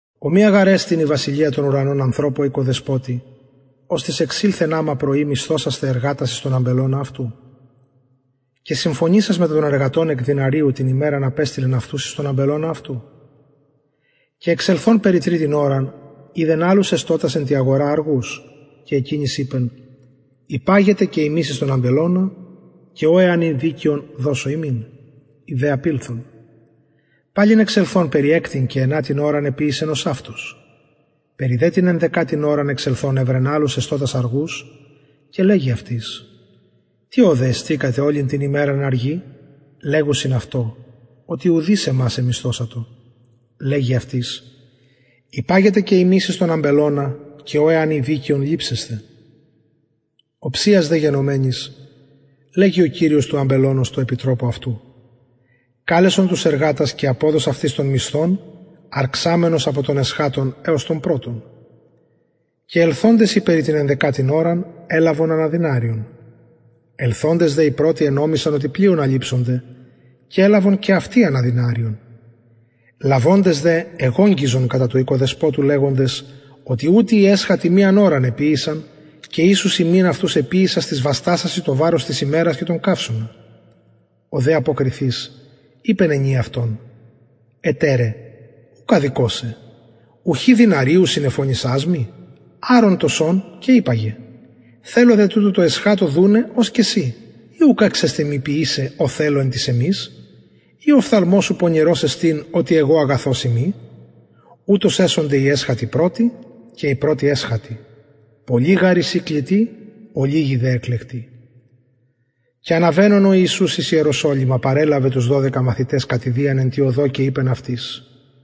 ομοια γαρ εστιν η βασιλεια των ουρανων ανθρωπω οικοδεσποτη οστις εξηλθεν αμα πρωι μισθωσασθαι εργατας εις τον αμπελωνα αυτου και συμφωνησας μετα των εργατων εκ δηναριου την ημεραν απεστειλεν αυτους εις τον αμπελωνα αυτου και εξελθων περι τριτην ωραν ειδεν αλλους εστωτας εν τη αγορα αργους και εκεινοις ειπεν υπαγετε και υμεις εις τον αμπελωνα και ο εαν η δικαιον δωσω υμιν οι δε απηλθον παλιν εξελθων περι εκτην και ενατην ωραν εποιησεν ωσαυτως περι δε την ενδεκατην ωραν εξελθων ευρεν αλλους εστωτας αργους και λεγει αυτοις τι ωδε εστηκατε ολην την ημεραν αργοι λεγουσιν αυτω οτι ουδεις ημας εμισθωσατο λεγει αυτοις υπαγετε και υμεις εις τον αμπελωνα και ο εαν η δικαιον ληψεσθε οψιας δε γενομενης λεγει ο κυριος του αμπελωνος τω επιτροπω αυτου καλεσον τους εργατας και αποδος αυτοις τον μισθον αρξαμενος απο των εσχατων εως των πρωτων και ελθοντες οι περι την ενδεκατην ωραν ελαβον ανα δηναριον ελθοντες δε οι πρωτοι ενομισαν οτι πλειονα ληψονται και ελαβον και αυτοι ανα δηναριον λαβοντες δε εγογγυζον κατα του οικοδεσποτου λεγοντες οτι ουτοι οι εσχατοι μιαν ωραν εποιησαν και ισους ημιν αυτους εποιησας τοις βαστασασιν το βαρος της ημερας και τον καυσωνα ο δε αποκριθεις ειπεν ενι αυτων εταιρε ουκ αδικω σε ουχι δηναριου συνεφωνησας μοι αρον το σον και υπαγε θελω δε τουτω τω εσχατω δουναι ως και σοι η ουκ εξεστιν μοι ποιησαι ο θελω εν τοις εμοις ει ο οφθαλμος σου πονηρος εστιν οτι εγω αγαθος ειμι ουτως εσονται οι εσχατοι πρωτοι και οι πρωτοι εσχατοι πολλοι γαρ εισιν κλητοι ολιγοι δε εκλεκτοι και αναβαινων ο ιησους εις ιεροσολυμα παρελαβεν τους δωδεκα μαθητας κατ ιδιαν εν τη οδω και ειπεν αυτοις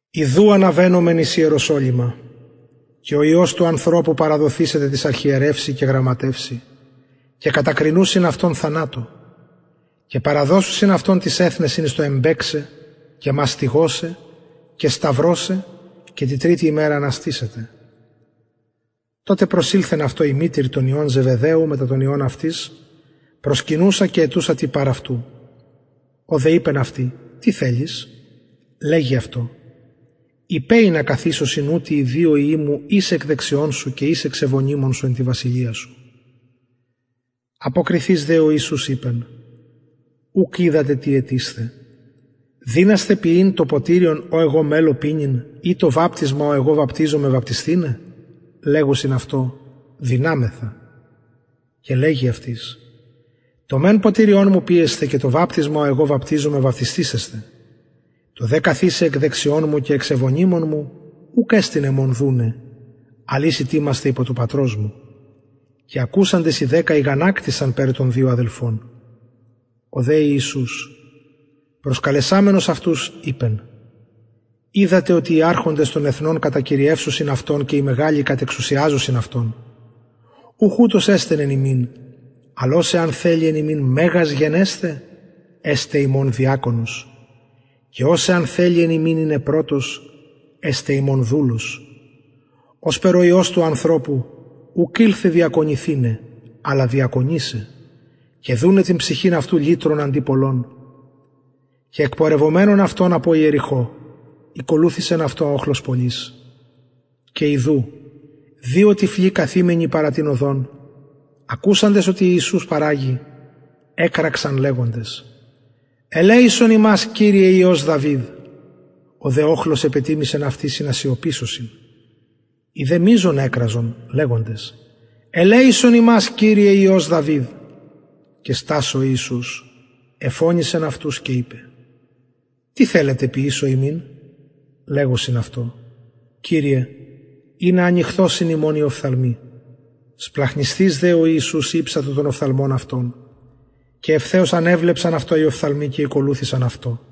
ιδου αναβαινομεν εις ιεροσολυμα και ο υιος του ανθρωπου παραδοθησεται τοις αρχιερευσιν και γραμματευσιν και κατακρινουσιν αυτον θανατω και παραδωσουσιν αυτον τοις εθνεσιν εις το εμπαιξαι και μαστιγωσαι και σταυρωσαι και τη τριτη ημερα αναστησεται τοτε προσηλθεν αυτω η μητηρ των υιων ζεβεδαιου μετα των υιων αυτης προσκυνουσα και αιτουσα τι παρ αυτου ο δε ειπεν αυτη τι θελεις λεγει αυτω ειπε ινα καθισωσιν ουτοι οι δυο υιοι μου εις εκ δεξιων σου και εις εξ ευωνυμων σου εν τη βασιλεια σου αποκριθεις δε ο ιησους ειπεν ουκ οιδατε τι αιτεισθε δυνασθε πιειν το ποτηριον ο εγω μελλω πινειν η το βαπτισμα ο εγω βαπτιζομαι βαπτισθηναι λεγουσιν αυτω δυναμεθα και λεγει αυτοις το μεν ποτηριον μου πιεσθε και το βαπτισμα ο εγω βαπτιζομαι βαπτισθησεσθε το δε καθισαι εκ δεξιων μου και εξ ευωνυμων μου ουκ εστιν εμον δουναι αλλ οις ητοιμασται υπο του πατρος μου και ακουσαντες οι δεκα ηγανακτησαν περι των δυο αδελφων ο δε ιησους προσκαλεσαμενος αυτους ειπεν οιδατε οτι οι αρχοντες των εθνων κατακυριευουσιν αυτων και οι μεγαλοι κατεξουσιαζουσιν αυτων ουχ ουτως δε εσται εν υμιν αλλ ος εαν θελη εν υμιν μεγας γενεσθαι εσται υμων διακονος και ος εαν θελη εν υμιν ειναι πρωτος εστω υμων δουλος ωσπερ ο υιος του ανθρωπου ουκ ηλθεν διακονηθηναι αλλα διακονησαι και δουναι την ψυχην αυτου λυτρον αντι πολλων και εκπορευομενων αυτων απο ιεριχω ηκολουθησεν αυτω οχλος πολυς και ιδου δυο τυφλοι καθημενοι παρα την οδον ακουσαντες οτι ιησους παραγει εκραξαν λεγοντες ελεησον ημας κυριε υιος δαυιδ ο δε οχλος επετιμησεν αυτοις ινα σιωπησωσιν οι δε μειζον εκραζον λεγοντες ελεησον ημας κυριε υιος δαυιδ και στας ο ιησους εφωνησεν αυτους και ειπεν τι θελετε ποιησω υμιν λεγουσιν αυτω κυριε ινα ανοιχθωσιν ημων οι οφθαλμοι σπλαγχνισθεις δε ο ιησους ηψατο των οφθαλμων αυτων και ευθεως ανεβλεψαν αυτων οι οφθαλμοι και ηκολουθησαν αυτω